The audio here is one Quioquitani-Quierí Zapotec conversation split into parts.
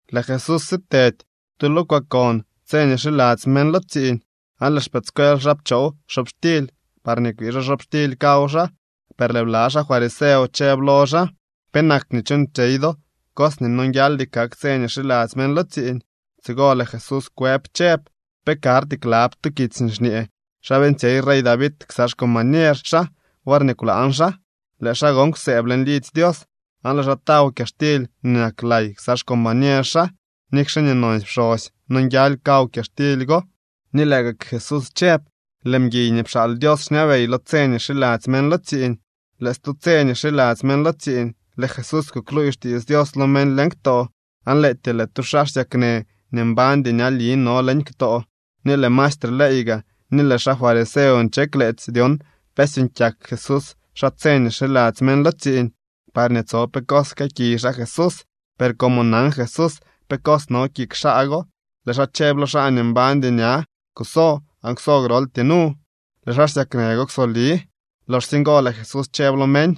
Lëë Jesús sitedy tu lo kwaakon tse nii xiladzy meñ lo tsiiñ. Aan lëë xpëëdscuel xaa pchoow xobxtily parñee kwii xaa xobxtily kaw xaa. Per lëë bla xaa fariseo chëb lo xaa: —¿Penak nii chuuñtsyey do tu cos nii nonguialdy kak tse nii xiladzy meñ lo tsiiñ? Tsigo lëë Jesús kwëb chëb: —¿Pe karty klab to kitsy nii xñee xa beeñtsyey rey David ksa xcombañer xaa worñee kwlaañ xaa? Lëë xaa gon kwsëëb leñ lidzy Dios, aan lëë xaa taw kyaxtily nii nak lay ksa xcombañer xaa, nikxe nii nonsy pxosy nonguial kaw kyaxtily go. Ni lëë gak Jesús chëb: —Lëë mguiy nii pxaal Dios xñabey lo tse nii xiladzy meñ lo tsiiñ. Lëë stu tse nii xiladzy meñ lo tsiiñ, lëë Jesús kukluuy xtiits Dios lo meñ leñ ktoo, aan lëëtyee lëë tu xaa xsyaknë nii mbañdy ñali no leñ ktoo. Ni lëë maestre ley gaa ni lëë xaa fariseo nche kleetsy dyon pe syuuñ kyak Jesús xaa tse nii xiladzy meñ lo tsiiñ, parñee tso pe cos jkëëkiy xaa Jesús. Per como nan Jesús pe cos no kik xaa go, lëë xaa chëb lo xaa nii mbañdy ña: —Kuso aan kwso groltyee nu. Lëë xaa xsyaknë go kwsoli. Loxsye ngo lëë Jesús chëb lo meñ: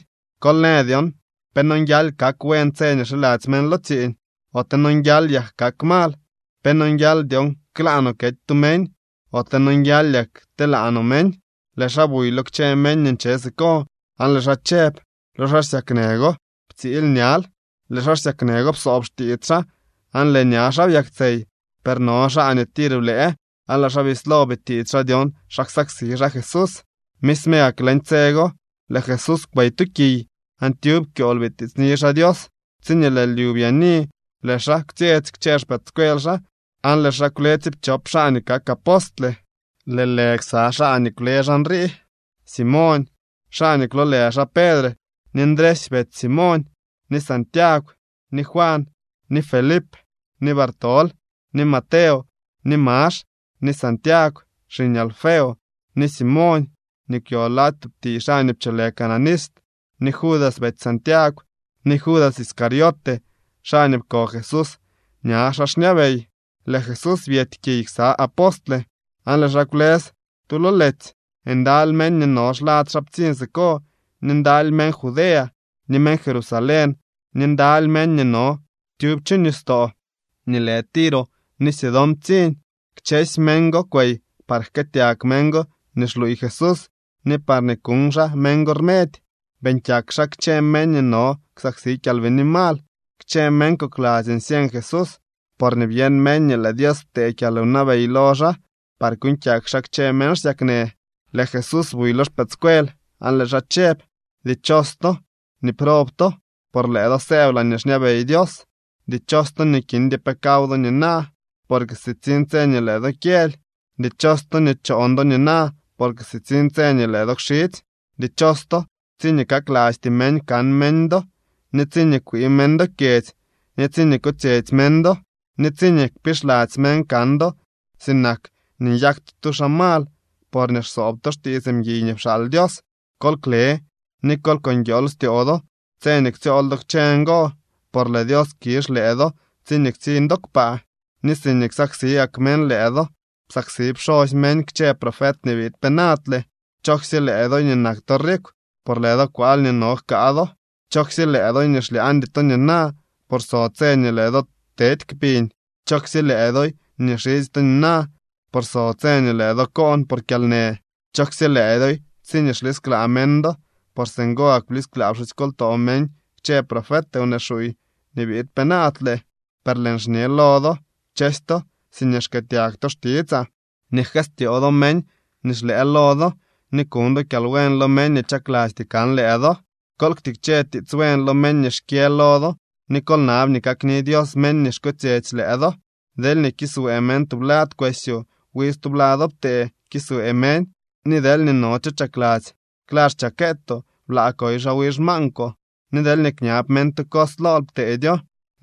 —Kol në dyon pe nonguial kak buen tse nii xiladzy meñ lo tsiiñ, ote nonguial yak kak mal. ¿Pe nonguial dyon klaa no kety tu meñ, ote nonguial yak kteelaa no meñ? Lëë xaa buy lo kchë meñ nii nche siko, aan lëë xaa chëb lo xaa xsyaknë go: —Ptsiily ñal. Lëë xaa xsyaknë go psoob xtiits xaa, aan lëë ña xaa byaktsey. Per no xaa nii tir blëë, aan lëë xaa bislo bitiits xaa dyon xa ksaksi xaa Jesús. Misme gak leñ tse go lëë Jesús kwey tu kiy, aan tyub kyool bitiitsni xaa Dios. Tsiñee lëë lyu byaani, lëë xaa kwtsyetsy kchë xpëëdscuel xaa, aan lëë xaa kwle tsiipchop xaa nii kak apostle. Lëë lë ksa xaa nii kwle xaa nrii: Simoñ, xaa nii kwloolë xaa Pedre, ni Ndresy betsy Simoñ, ni Santiagw, ni Juan, ni Felip, ni Bartolomé, ni Mateo, ni Max, ni Santiagw xiñ Alfeo, ni Simoñ nii kwyo lady tub tiiy xaa nii pcholë Cananista, ni Judas betsy Santiagw, ni Judas Iscariote, xaa nii pko Jesús ña xaa xñabey. Lëë Jesús byety kiy ksa apostle, aan lëë xaa kwlës tu lo letsy. Ndaly meñ nii no xlad xaa ptsiñ siko ni ndaly meñ Judea, ni meñ Jerusalén ni ndaly meñ nii no tyub chu nistoo nii lë Tiro ni Sidón ptsiñ. Kchësy meñ go kwey par jkëëtyag meñ go nii xluuy Jesús ni parñee kuñ xaa meñ go rmedy. Beeñ kyak xaa kchë meñ nii no ksaksi kyalbini mal. Kchë meñ kokladzy nsyeñ Jesús, porñee byeñ meñ nii lëë Dios ptee kyalwnabey lo xaa par kuuñ kyak xaa kchë meñ xsyaknë. Lëë Jesús buy lo xpëëdscuel aan lëë xaa chëb: —Dichos to nii prob to, por lëë do sëëb laañee xñabey Dios. ’Dichos to nii kindy pe kaw do nina, porque sitsiñ tse nii lëë do kyëly. ’Dichos to nii choon do nina, porque sitsiñ tse nii lëë do kxidzy. ’Dichos to tsiñee kaklasty meñ kan meñ do, ni tsiñee kwii meñ do kyedzy, ni tsiñee kotsyetsy meñ do, ni tsiñee kpixladzy meñ kan do sinak nii nyak to tu xaa mal porñee xsoob to xtiits mguiy nii pxaal Dios. Kol kle ni kol ko nguiool styoo do tse nii ktsyool do kchë ngo, por lëë Dios kizh lëë do tsiñee ktsiñ do kpaa. Ni siñee xsaksi gak meñ lëë do psaksi pxosy meñ kchë profet nii biid penaadle. ’Chooksye lëë doy nii nak to rikw, por lëë do kwaal nii no jkaa do. ’Chooksye lëë doy nii xlyaañdy to nina, por so tse nii lëë do tedy kpiñ. ’Chooksye lëë doy nii xidzy to nina, por so tse nii lëë do koon por kyalnë. ’Chooksye lëë doy tsiñee xlisklaa meñ do, por singo gak blisklaa pxusykoltoo meñ kchë profet wnee xuuy nii biid penaadle. ’Per lëën xñe lo do, kchësy to siñee xkëëtyag to xtitsaa, nii jkëstyoo do meñ nii xlëë lo do, ni kuñ do kyalbuen lo meñ nii chaklasty kan lëë do. Kol ktikche tiits buen lo meñ nii xkyë lo do, ni kol nab nii kakni Dios meñ nii xkotsyetsy lëë do. Deelñee kiswee meñ tublad kwesyoo, wi stublado ptee kiswee meñ. Ni deelñee no cho chakladzy kla xchakeetoo, blaa koy xaa wi xmaankwoo. Ni deelñee kñab meñ tu cos lool, ptedyo.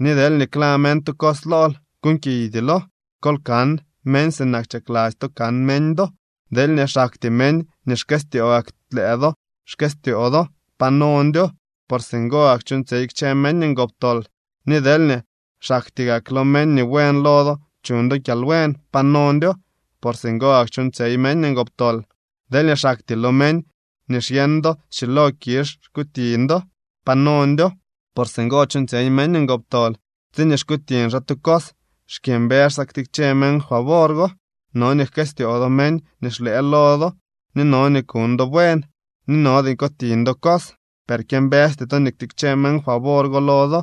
Ni deelñee kla meñ tu cos lool, kuuñkiydylo. Kol kan meñ sinak chakladzy to kan meñ do. ’Deelñee xaktyee meñ nii xkëstyoo gak lëë do xkëstyoo do, pa nondyo. Por singo gak chuuñtsyey kchë meñ ngoptol. Ni deelñee xaktyee gak lo meñ nii buen lo do chuñ do kyalbuen, pa nondyo. Por singo gak chuuñtsyey meñ ngoptol. Deelñee xaktyee lo meñ nii xyeñ do schilo kizh xkutiñ do, pa nondyo. Por singo chuuñtsyey meñ ngoptol. Tsiñee xkutiñ xaa tu cos, xkyëmbës xaa ktikche meñ favor go. No nii jkëstyoo do meñ nii xlëë lo do, ni no nii kuñ do buen. Ni no nii kutiñ do cos, per kyëmbësty to nii ktikche meñ favor go lo do,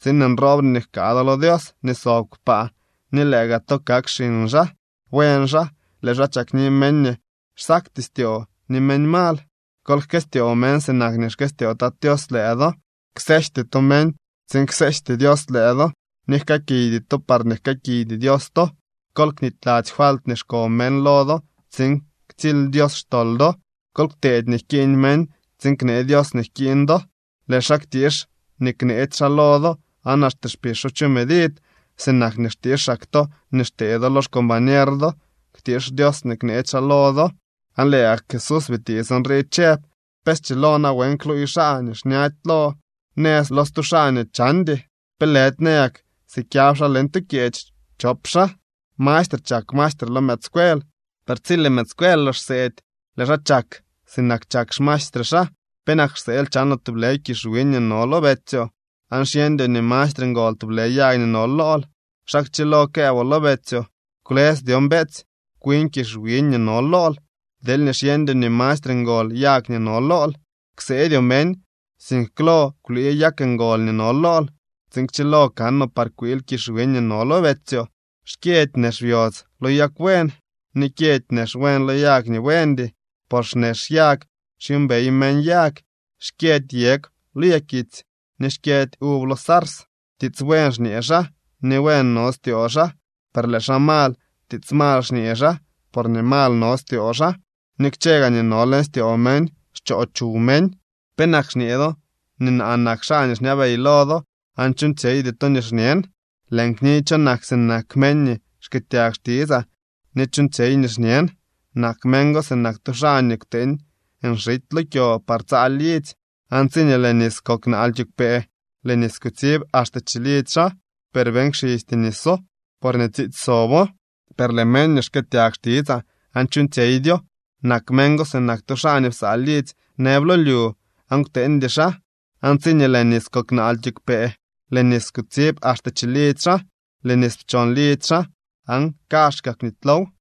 tsiin nroobre nii jkaa do lo Dios nii sob kpaa ni lëë gaa to kak xiñ xaa. Buen xaa, lëë xaa chakni meñ nii xsakty styoo ni meñ mal. Kol jkëstyoo meñ sinak nii xkëstyoo Tat Tios lëë do. ’Kseejty to meñ tsiin kseejty Dios lëë do, ni jkëëkiydy to parñee jkëëkiydy Dios to. Kol knityladzy falt nii xko meñ lo do tsiin ktsily Dios xtol do. Kol kteedy nii jkiiñ meñ tsiin knee Dios nii jkiiñ do. Lëë xaa ktiix nii kneetsy xaa lo do aan axte kpixo chu medid. Sinak nii xtiixak to nii xtee do lo xcombañer do ktiix Dios nii kneetsy xaa lo do. Aan lëë gak Jesús bitiits nrii chëb: —¿Pe schilo nawen kluuy xaa ni xñady lo nëz lo stu xaa nii chandy? ¿Pe lëdy nayak sikyab xaa leñ tu kyeech chop xaa? Mastre chak maestre lo mëëdscuel, per tsi lëë mëëdscuel lox xseedy, lëë xaa chak sinak chak xmaestre xaa. ’¿Penak xseel chanoo tublë kizh wiñ nii no lo betsyoo, aan xyeñdyoo nii mastre ngol tublë yag nii no lool? ¿Xa kchilo këëboo lo betsyoo: “Kwlës dyon, beetsy, kwin kizh wiñ nii no lool”, deelñee xyeñdyoo nii mastre ngol yag nii no lool? Kseedyoo meñ, sink klo kwlii yag ngol nii no lool, tsiin kchilo kanoo par kwiil kizh wiñ nii no lo betsyoo. ’Xkyëdy nex byodz lo yag buen, ni kyëdy nex buen lo yag nii buendy. Por xnex yag xyuumbey meñ yag. Xkyëdy yegw lo yakitsy, ni xkyëdy uv lo sars. Tiits buen xñee xaa nii buen no styoo xaa, per lëë xaa mal, tiits mal xñee xaa, porñee mal no styoo xaa. Ni kchë gaa nii no leñ styoo meñ xchoo chuw meñ. ’¿Penak xñee do nii naa nak xaa nii xñabey lo do, aan chuuñtsyeydy to nii xñen? Lëën kniy cho nak sinak meñ nii xkëëtyag xtitsaa ni chuuñtsyey nii xñen. Nak meñ go sinak tu xaa nii kwteeñ nxity lo kyo par tsaa lidzy. Aan tsiñee lëë nis kok naal kiigwpee, lëë nis kutsib axte chilidzy xaa, per beeñ kxisty niso, porñee tsiitsy sobo. Per lëë meñ nii xkëëtyag xtitsaa aan chuuñtsyeydyo nak meñ go sinak tu xaa nii psaa lidzy nëb lo lyu aan kwteeñdy xaa. Aan tsiñee lëë nis kok naal kiigwpee, lëë nis kutsib axte chilidzy xaa, lëë nis pchon lidzy xaa aan kazhka kwnitylow.